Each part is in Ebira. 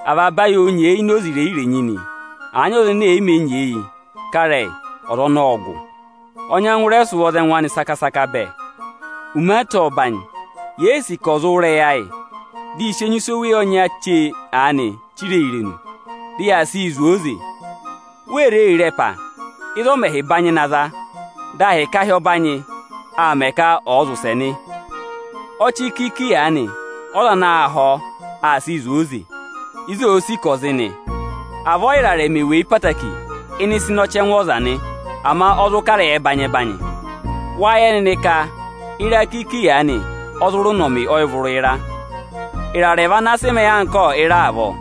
Avaba ayị oō nyeeyi ini oze irenyi-irenyi nị. Àa nyị ọza ene è yi mē nyeeyi kà ịrẹyị, ọza ọnọọ ọ́ọ gụ; ọ nyẹngụ rẹ sị ụvọ za ẹngụ anị bẹẹ. Umaata ọ́ọ banyị; yèe sì ka ọ̀ zụ wụ́ ịrẹyị ayị, dị ị sị enyusẹ oweyi ọnya chee aanị chiree irenu, dị yaa sịị zụ̀ ọọ oze. Wéé re re ẹpa, ịzị ọ mẹ̀ hi banyị na za, dị ahịka ahị ọbanyị aa mẹ ka ọ̀ zị ụsẹ nị? Ọchị kiiki aanị ọ́za ana aa họ̀ ọ, aa sịị zụ̀ ọọ oze, ịzị òo sì ka ọ̀ zị nị. Avọọ ị́rarẹ mè weyi ẹtẹẹtẹrẹ ịnị ịsa ịnị ọchẹngụ ọza nị, ama ọ zụ kà ịrẹyị ẹbanyị-ẹbanyị. Wáa yẹ nịnị ka ịra kiiki aanị ọ zụ rị ụnọmị ọyịvụrụ ịra. Ịrarẹ vị ana sị mẹẹ anka ịra avọọ.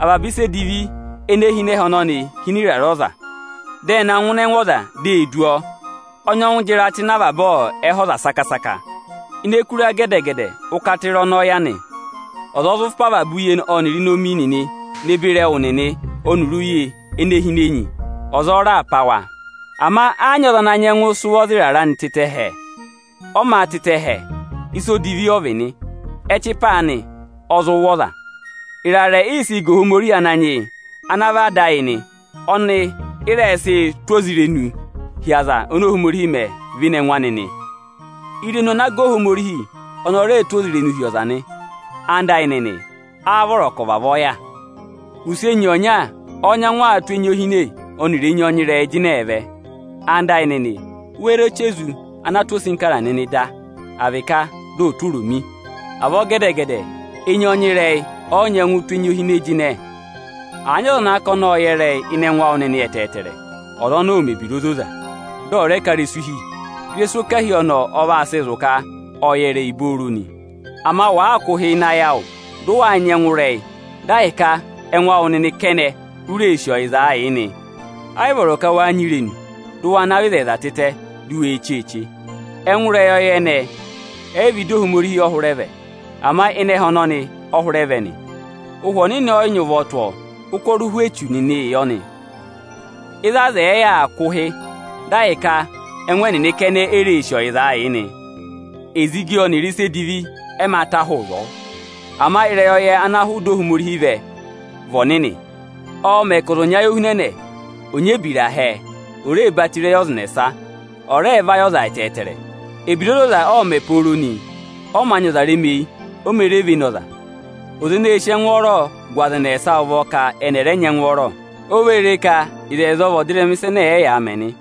Avaba ịsa edivi ene hi ịnị ẹhẹ ọnọnị hi ịnị ịrarẹ ọza, dị ẹ na ngụ ịnị ẹngụ ọza, dị e du ọ. Ọ nyẹngụ jị ịra tụ́ ịnị avaba ẹhẹ ọza saka-saka. Ini eku ịra gẹdẹ-gẹdẹ ụ́kata ịra ọnọọ yà nị. Ọza ọ zụ pá avaba uye ọnịrị inomi nịnị ne beri ẹwụ nịnị ọnịrị uye ene hi ini enyi; ọza ọ raà pá wa da. Ama ẹ́ yị nyị ọza ana nyẹngụ sị ụvọ za ịrarẹ tịtẹ hẹẹ. Ọ mā tịtẹ hẹẹ, ịsa odivi ọ vị nị, ẹchịpa anị ọ zụ wụ̀ ọza. Ịrarẹ ị sịị̄ ga Ohomorihi Ananyị yị ana vị Ada ayị nị. Ọnị ị rẹ sịị̄ tụ́ ozirenuu hi aza ọnị Ohomorihi mẹ véné ẹngụ anị nị. Irenu ana aa sị ga Ohomorihi, ọnị a rẹẹ̄ sị tụ́ ozirenuu hi ọza nị. Ẹwụ nịnị ẹyịnyara amị, áá vọrọ ka ọ̀ vavọọ yà? Ụsị enyi ọnya ọ́ọ́ nyẹngụ aa tụ́ enyi ohine ọnịrị enyi ọnyịrẹyịị jịnẹẹ vẹ? Ẹwụ nịnị ẹyịnyara amị, wéé re ọchị ezu ana aa tụ́ osinkara nịnị da, à vị ka dị ọ̀ọ tụ́ oromi? Avọọ gẹdẹ-gẹdẹ ụsị enyi ọnyịrẹyị ẹ yị nyẹngụ tụ́ enyi ohine jịnẹ. Àa nyị ọza ana ka ọnị ọ́ọ yẹ ịrẹyị, ene eyi anị hweyi ịnị ẹngụ awụ nịnị, ọza ọnọọ ọ̀ mẹ̀ ebira ozoza, dị ọ̀ rẹ ká ịrẹsụ hi. Ịrẹsụ ọkahi ọnọọ ọ vaa sị zụ̀ ka ọ́ọ yẹ ịrẹyị nị. Ama wàaa kụ́ ụhị ịnị ayị awụ, dị ụ wáa nyị ẹngụrẹyị, dị ahịka ẹngụ awụ nịnị kẹnẹ u ree sì ọyịzaa yị nị, ẹ́ yị vọrọ ka waa nyị irenu, dị ụ wa navọ ịzẹyịza tịtẹ di u wee cheeche. Ẹngụ ịrẹyọyẹ ẹnẹẹ ẹ́ yị vị ịdị Ohomorihi ẹ hụrẹ vẹ, ama ịnị ẹhẹ ọnọnị ẹ hụrẹ vẹ nị, Ụhwẹ Ọnịnị ẹ́ yị nyị ụvọ tụ́ ọọ, ụkọrọ ụhwẹ echu nịnị ị yọ nị. Ịzị aza ẹ̀ẹ yà aa kụ̀ ụhị, dị ahịka ẹngụ ẹnịnị kẹnẹ e re sì ọyịza yị nị, ezigi ọnịrị ịsa edivi ẹ mā ta hụụ ịzọọ. Ama ịrẹyọyẹ ana hụụ ịdị Ohomorihi vẹ, vị ọnịnị, ọ́ọ mẹ ka ọza ọ̀ nyị ayị ohunẹnẹ; ọọ̄ nyị ebira hẹẹ, oō ree batọ ịrẹyị ọza ẹnẹsa, ọọ̄ rẹẹ vayị ọza ẹtẹẹtẹrẹ. Ebira ozoza ọọ̄ mẹ̀ pooro nị, ọ mā nyị ọza remeyi, oō mee re vene ọza. Ọza eneē sì ẹngwọọrọ gụ aza ẹnẹsa ụvọ ka ẹnị ẹ̀ rẹ nyị ẹngwọọrọ. O vee re ka ịzẹyịza ọ vị ọdịrẹma ịsa ẹnẹ ẹyaa mẹ nị.